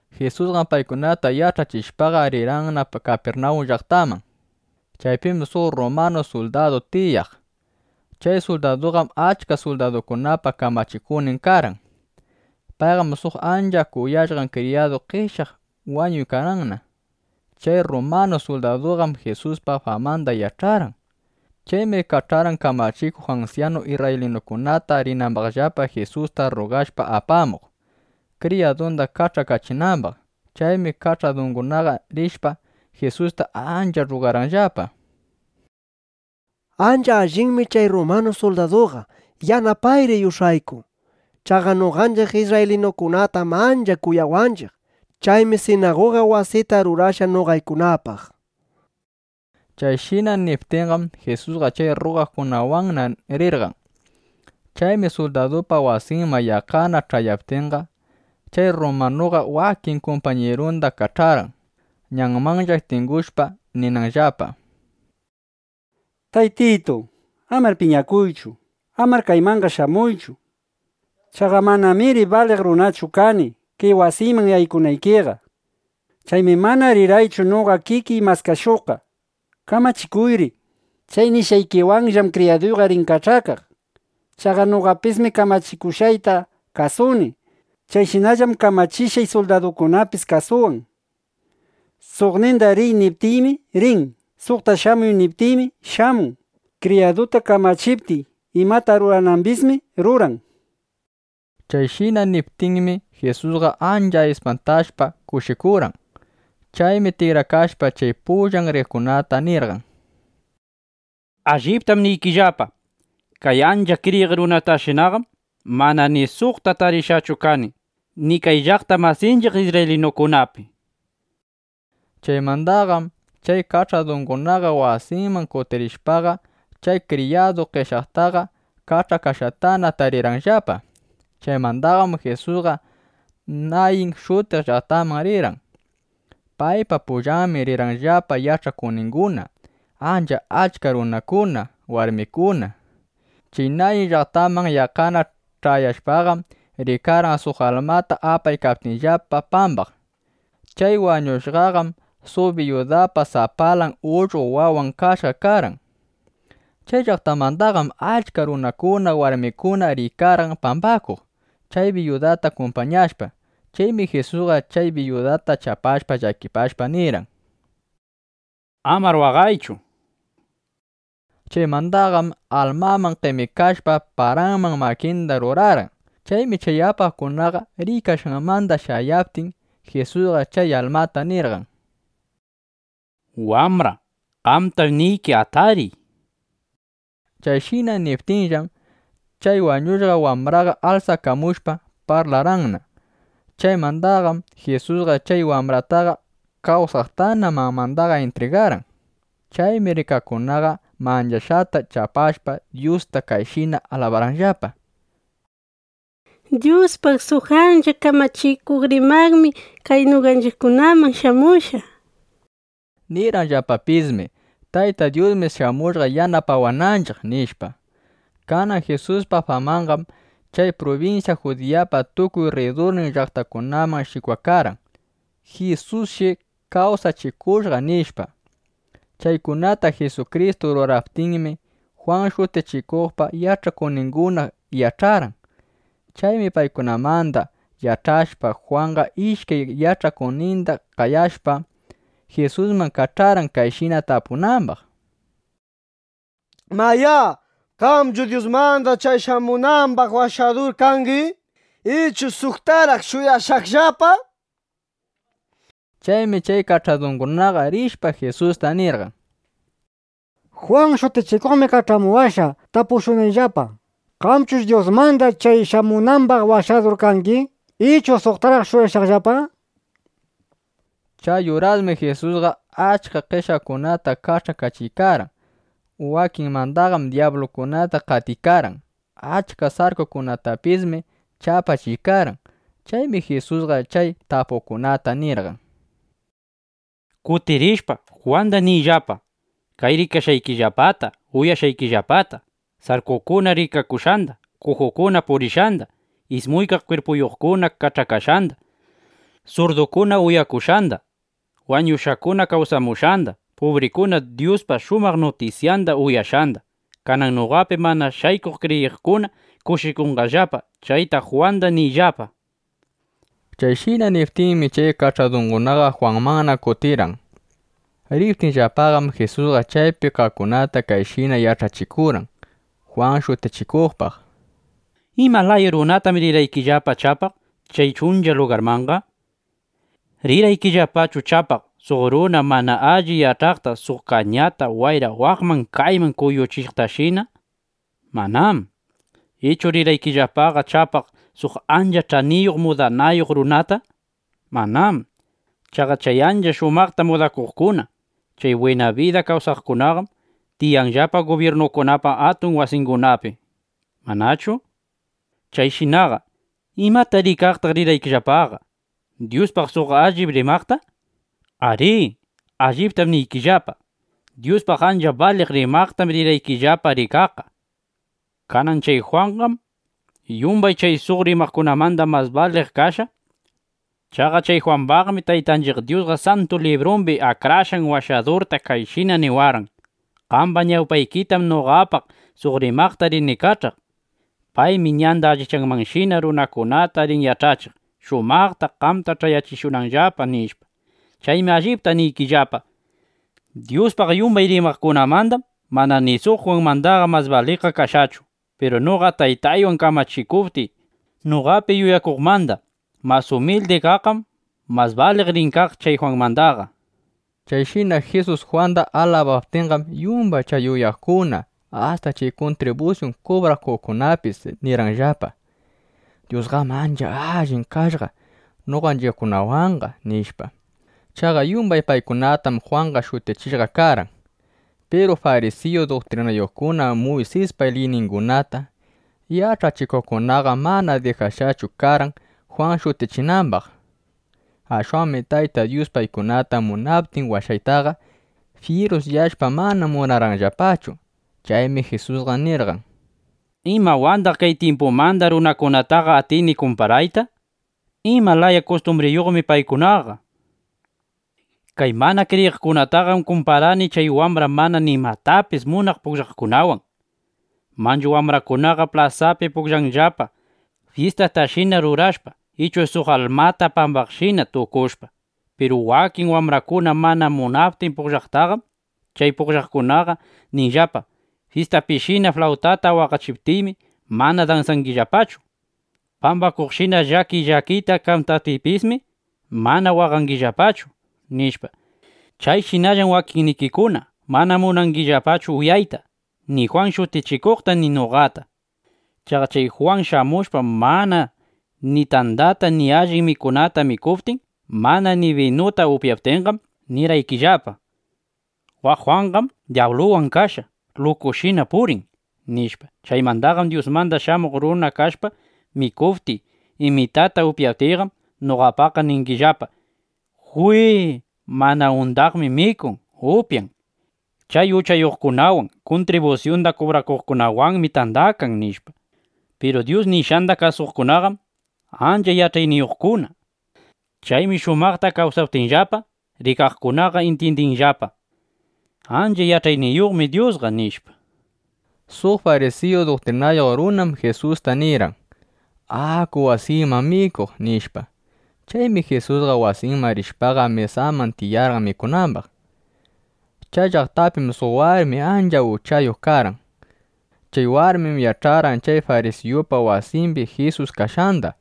Jisusqam paykunata yach'achishpaqa, rirqanna Kapirnawun llaqtaman. Chaypim suq rrumanu suldadu tiyaq. Chay suldaduqam achka suldadukunapa kamachikuqnin karqan. Paypam suq ancha kuyashqan kriyadun qeshyaq wañuykarqanna. Chay rrumanu suldaduqam Jisuspa famanda yach'arqan. Chaymi kach'arqan kamachikuq ansyanu isrraylinukunata, rinambaqllapa Jisusta rrugashpa apamuq, kriyadunda kach'akachinambaq. Chaymi kach'adungunaqa rishpa, Jisusta ancha rrugarqanllapa: —Ancha allinmi chay rrumanu suldaduqa. Yanapayri yush'ayku. Chaqa noqanchiq isrraylinukunatam ancha kuyawanchiq. Chaymi sinaguga wasita rurashqa noqaykunapaq, nishpa. Chayshina niptinqam, Jisusqa chay rrugaqkunawanna rirqan. Chaymi suldadupa wasinman yaqqana ch'ayaptinqa, chay rrumanuqa wakin kumpañirunda kach'arqan, ñanmanlla tingushpa, ninanllapa: —Taytitu, amar piñakuychu. Amanar kaykamanqa shamuychu. Chaqa manamir baliq runachu kani, kay wasiyman yaykunaykiqa. Chaymi mana rirqaychu noqa kikiy maskashuqqa. Kamachikuyri. Chay nishqaykiwanllam kriyaduyqa rin kach'akaq. Chaqa noqapismi kamachiwaqta kasuni. Chayshinallam kamachishqay suldaduykunapis kasuwan. Suqninda “Riy”, niptiymi, rin. Suqta “Shamuy”, niptiymi, shamun. Kriyaduyta kamachiptiy, imata ruranambismi ruran. Chayshina niptinmi, Jisusqa ancha ispantashpa, kushikurqan. Chaymi tikrakashpa chay pullan riqkunata nirqan: —Alliptam niykillapa, kay ancha kriyiq runatashinaqam mana ni suqta tarishqachu kani, ni kay llaqta masinchiq isrraylinukunapi, nishpa. Chaymandaqam chay kach'adungunaqa wasiman kutirishpaqa, chay kriyadun qeshyaqtaqa kach'akashqatana tarirqanllapa. Chaymandaqam Jisusqa Nayin shutiq llaqtamanna rirqan. Paypa pullanmi rirqanllapa yach'akuqninguna, ancha achka runakuna, warmikuna. Chay Nayin llaqtaman yaqqana ch'ayashpaqam, rikarqan suq almata apaykaptinllapa pambaq. Chay wañushqaqam suq biyudapa sapalan ullqo wawan kashqa karqan. Chay llaqtamandaqam achka runakuna, warmikuna riykarqan pambakuq, chay biyudata kumpañashpa. Chaymi Jisusqa chay biyudata chapashpa, llakipashpa nirqan: —Amar waqaychu, nishpa. Chaymandaqam almaman qemikashpa, paranman makinda rurarqan. Chaymi chay apaqkunaqa riykashqanmanda shayaptin, Jisusqa chay almata nirqan: —Wambra, qamtam niyki, ¡atariy! nishpa. Chayshina niptinllam, chay wañushqa wambraqa alsakamushpa, parlarqanna. Chaymandaqam Jisusqa chay wambrataqa kawsaqtana mamanda intrigarqan. Chaymi rikaqkunaqa manchashqata chapashpa, Dyusta kayshina alabarqanllapa: —¡Dyuspaq suq ancha kamachikuq rimaqmi kay noqanchiqkunaman shamushqa! nishpa. Nirqanllapapismi: —Tayta Dyusmi shamushqa yanapawananchiq, nishpa. Kanan Jisuspa famanqam chay prubinsya Judiyapa tukuy rridurnin llaqtakunaman shikwakarqan, “Jisusshi kawsachikushqa”, nishpa. Chaykunata Jisukristu ruraptinmi, Jwan Shutichikuqpa yach'akuqninguna yach'arqan. Chaymi paykunamanda yach'ashpa, Jwanqa ishkay yach'akuqninda qayashpa, Jisusman kach'arqan, kayshina tapunambaq: —Mayá, ¿qamchu Dyusmanda chay shamunambaq Washadur kangi, ichu suqtaraq shuyashaqllapa? nishpa. Chaymi chay kach'adungunaqa rishpa, Jisusta nirqan: —Jwan Shutichikuqmi kach'amuwashqa tapushunayllapa: “¿Qamchush Dyusmanda chay shamunambaq Washadur kangi, ichu suqtaraq shuyashaqllapa?” nishpa. Chay urasmi Jisusqa achka qeshyaqkunata kach'akachiykarqan. Wakinmandaqam dyablukunata qatiykarqan. Achka sarkukunatapismi chapachiykarqan. Chaymi Jisusqa chay tapuqkunata nirqan: —Kutirishpa, Jwanda niyllapa kay rikashqaykillapata, uyashqaykillapata, sarkukuna rikakushqanda, kujukuna purishqanda, ismuykaq kwirpuyuqkuna kach'akashqanda, surdukuna uyakushqanda, wañushqakuna kawsamushqanda, pubrikuna Dyuspa shumaq nutisyanda uyashqanda. Kanan noqapi mana shaykuq kriyiqkuna kushikunqallapa. Chayta Jwanda niyllapa, nishpa. Chayshina niptinmi, chay kach'adungunaqa Jwanmanna kutirirqan. Riptinllapaqam, Jisusqa chaypi kaqkunata kayshina yach'achikurqan Jwan Shutichikuqpaq: —¿Ima laya runatam rirqaykillapa chapaq chay chuncha lugarmanqa? ¿Rirqaykillapachu chapaq suq runa mana alli yach'aqta, suq kañata wayra waqman kayman kuyuchiqtashina? Manám. ¿Ichu rirqaykillapaqa chapaq suq ancha ch'aniyuq mudanayuq runata? Manám. Chaqa chay ancha shumaqta mudakuqkuna, chay bwina bida kawsaqkunaqam tiyanllapa gubyirnukunapa atun wasingunapi, ¿manachu? Chayshinaqa ¿imata rikaqtaq rirqaykillapaqa? ¿Dyuspaq suq allip rimaqta? Arí, alliptam niykillapa, Dyuspaq ancha baliq rimaqtam rirqaykillapa rikaqqa. Kanan chay Jwanqam yumbay chay suq rimaqkunamanda mas baliq kashqa. Chaqa chay Jwambaqmi Taytanchiq Dyusqa Santu Librumbi Akrashqan Washadurta kayshina niwarqan: Qamba ñawpaykitam noqapaq suq rimaqta rini kach'aq. Paymi ñanda allichanmanshina runakunata rin yach'achiq, shumaqta qamta ch'ayachishunanllapa, nishpa. Chaymi allipta niykillapa, Dyuspaq yumbay rimaqkunamandam mana ni suq Jwanmandaqa mas baliqqa kashqachu. Piru noqa Taytaywan kamachikuptiy, noqapi yuyakuqmanda mas umildi kaqqam mas baliq rin kaq chay Jwanmandaqa, nishpa. Chayshina Jisus Jwanda alabaptinqam, yumbay chay uyaqkuna asta chay kuntribusyun kubrakuqkunapis nirqanllapa: —Dyusqam ancha allin kashqa noqanchiqkunawanqa, nishpa. Chaqa yumbay paykunatam Jwanqa shutichishqa karqan. Piru farisiyu duktrinayuqkuna, Muysispa liyningunata yach'achikuqkunaqam mana dijakashqachu karqan Jwan shutichinambaq. Ashwanmi Tayta Dyus paykunata munaptin washaytaqa, fyirusyashpa mana munarqanllapachu. Chaymi Jisusqa nirqan: —¿Imawandaq kay tyimpumanda runakunataqa atini kumparayta? ¿Ima laya kustumbriyuqmi paykunaqa? Kay mana kriyiqkunataqam kumparani chay wambra mana nimatapis munaq pugllaqkunawan. Manchu wambrakunaqa plasapi pugllanllapa, fyistatashina rurashpa ichu suq almata pambaqshina tukushpa. Piru wakin wambrakuna mana munaptin pugllaytaqam, chay pugllaqkunaqa ninllapa: “¡Fyistapishina flawtata waqachiptiymi, mana dansangillapachu! ¡Pambakuqshina llakiy llakiyta kantaptiypismi, mana waqangillapachu!” nishpa. (Chayshinallam wakinnikikuna mana munangillapachu uyayta ni Jwan Shutichikuqta ni noqata). Chaqa chay Jwan shamushpa, mana ni tandata ni allin mikunata mikuptin, mana ni binuta upyaptinqam, nirqaykillapa: “Waq Jwanqam dyabluwan kashpa, lukushina purin”, nishpa. Chaymandaqam Dyusmanda Shamuq Runa kashpa mikuptiy, imitata upyaptiyqam, noqapaq ningillapa: “¡Jwi, mana undaqmi mikun, upyan! Chay uchayuqkunawan, kuntribusyunda kubrakuqkunawanmi tandakan”, nishpa. Piru Dyus nishqanda kasuqkunaqam ancha yach'ayniyuqkuna. Chaymi shumaqta kawsaptinllapa, rikaqkunaqa intyindinllapa: Ancha yach'ayniyuqmi Dyusqa, nishpa. Suq farisiyu duktrinayuq runam Jisusta nirqan: —Aku wasiyman mikuq, nishpa. Chaymi Jisusqa wasinman rishpaqa, mesaman tiyarqan mikunambaq. Chay llaqtapim suq warmi ancha uchayuq karqan. Chay warmim yach'arqan chay farisiyupa wasimbi Jisus kashqanda.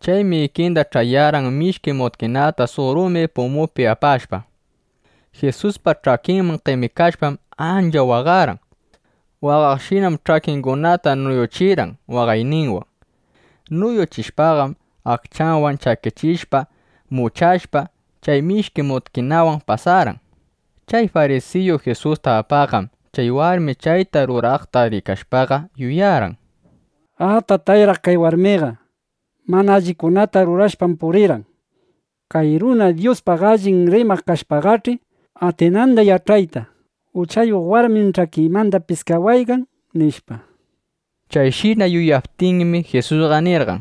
Chaymi ikinda ch'ayarqan mishki mutkinata suq rumi pumupi apashpa. Jisuspa ch'akinman qemikashpam, ancha waqarqan. Waqaqshinam ch'akingunata nuyuchirqan waqayninwan. Nuyuchishpaqam aqchanwan chakichishpa, muchashpa, chay mishki mutkinawan pasarqan. Chay farisiyu Jisusta apaqqam chay warmi chayta ruraykaqta rikashpaqa, yuyarqan: Atatayraq kay warmiqa. Mana allikunata rurashpam purirqan. Kay runa Dyuspaq allip rimaq kashpaqach'i, atinanda yach'ayta: Uchayuq warmim ch'akiymanda piskawaykan, nishpa. Chayshina yuyaptinmi, Jisusqa nirqan: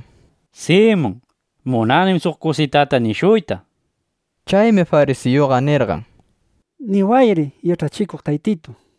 —Simun, munanim suq kusitata nishuyta. Chaymi farisiyuqa nirqan: —Niwayri, Yach'achikuq Taytitu, nishpa.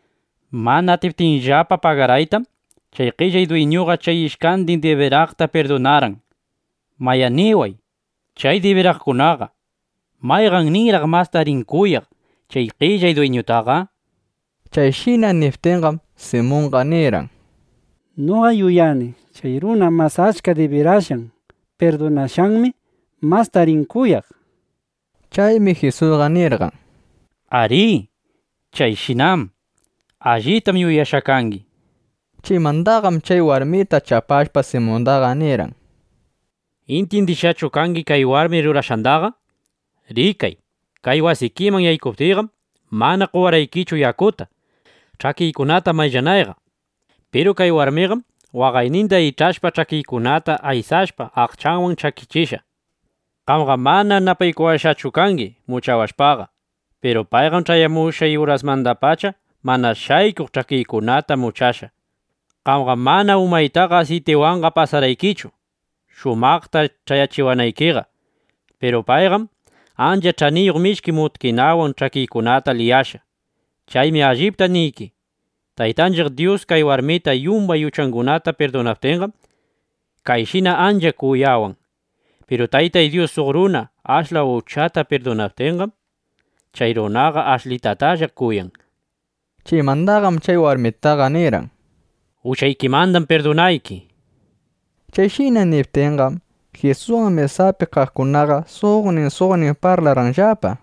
Mana atiptinllapa pagaraytam, chay qellay dwiñuqa chay ishkandin dibiraqta pirdunarqan. Mayá, niway, chay dibiraqkunaqa, ¿mayqanninraq masta rin kuyaq chay qellay dwiñutaqa? nishpa. Chayshina niptinqam, Simunqa nirqan: —Noqam yuyani, chay runa mas achka dibirashqan pirdunashqanmi mastaqa rin kuyaq, nishpa. Chaymi Jisusqa nirqan: —Arí, chayshinam. Allitam yuyashqa kangi, nishpa. Chaymandaqam chay warmita chapashpa, Simunda nirqan: —¿Intyindishqachu kangi kay warmi rurashqandaqa? Rikay, kay wasikiman yaykuptiyqam, mana qowarqaykichu yakuta, ch'akiykunata mayllanayqa. Piru kay warmiqam waqayninda ich'ashpa, ch'akiykunata aysashpa, aqchanwan chakichishqa. Qamqam mana napaykuwashqachu kangi muchawashpa. Piru payqam ch'ayamushqay urasmandapacha mana shaykuq ch'akiykunata muchashqa. Qamqam mana umaytaqa asiytiwanqa pasarqaykichu, shumaqta ch'ayachiwanaykiqa. Piru payqam ancha ch'aniyuq mishki mutkinawan ch'akiykunata liyashqa. Chaymi allipta niyki, Taytanchiq Dyus kay warmita yumbay uchangunata pirdunaptinqam, kayshina ancha kuyawan. Piru Tayta Dyus suq runa ashla uchayuqta pirdunaptinqam, chay runaqa ashlitatalla kuyan, nishpa. Chaymandaqam chay warmitaqa nirqan: —Uchaykimandam pirdunayki, nishpa. Chayshina niptinqam, Jisuswan mesapi kaqkunaqa, suqnin suqnin parlarqanllapa: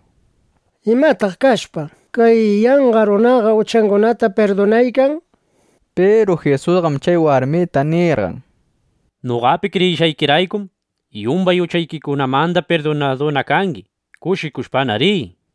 —¿Imataq kashpa, kay yanqa runaqa uchangunata pirdunaykan? nishpa. Piru Jisusqam chay warmita nirqan: —Noqapi kriyishqaykiraykum, yumbay uchaykimanda pirdunaduna kangi. Kushikushpana riy, nishpa.